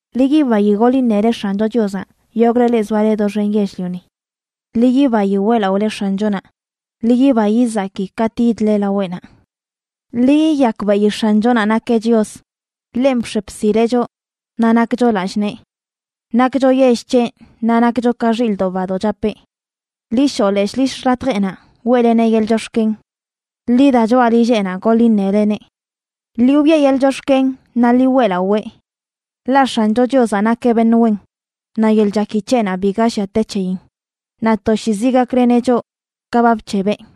Ḻi yibayi goḻ iṉele X̱ancho Chiozaꞌ, yogꞌle leꞌ zoale doxen yell-lioni. Ḻi yibayi weꞌlaꞌole X̱anchonaꞌ, ḻi yiba yizaki katꞌ yidle laweꞌnaꞌ. Ḻi yiyakbeꞌi X̱anchonaꞌ nakeꞌ Chios; ḻenꞌ bx̱e bsileꞌ choꞌ naꞌ nakcho lallꞌ nee. Nakcho yell c̱heꞌ, naꞌ nakcho ka xilꞌdoꞌ badoꞌ chapeꞌ. Ḻi shoꞌ leshꞌ lill xḻatjeꞌnaꞌ weꞌleneꞌ yeḻꞌ chox̱ken; ḻi da, choꞌa lilleꞌnaꞌ goḻ iṉeleneꞌ. Ḻi wiꞌe yeḻꞌ chox̱ken naꞌ ḻi weꞌlawee. Ḻaꞌ X̱ancho Chiozaꞌ nakeꞌ beṉꞌ wen, naꞌ yeḻꞌ chaki c̱heꞌnaꞌ biga llia te c̱heyin; naꞌ toshiizi gakleneꞌ choꞌ ka ba bc̱hebeꞌ.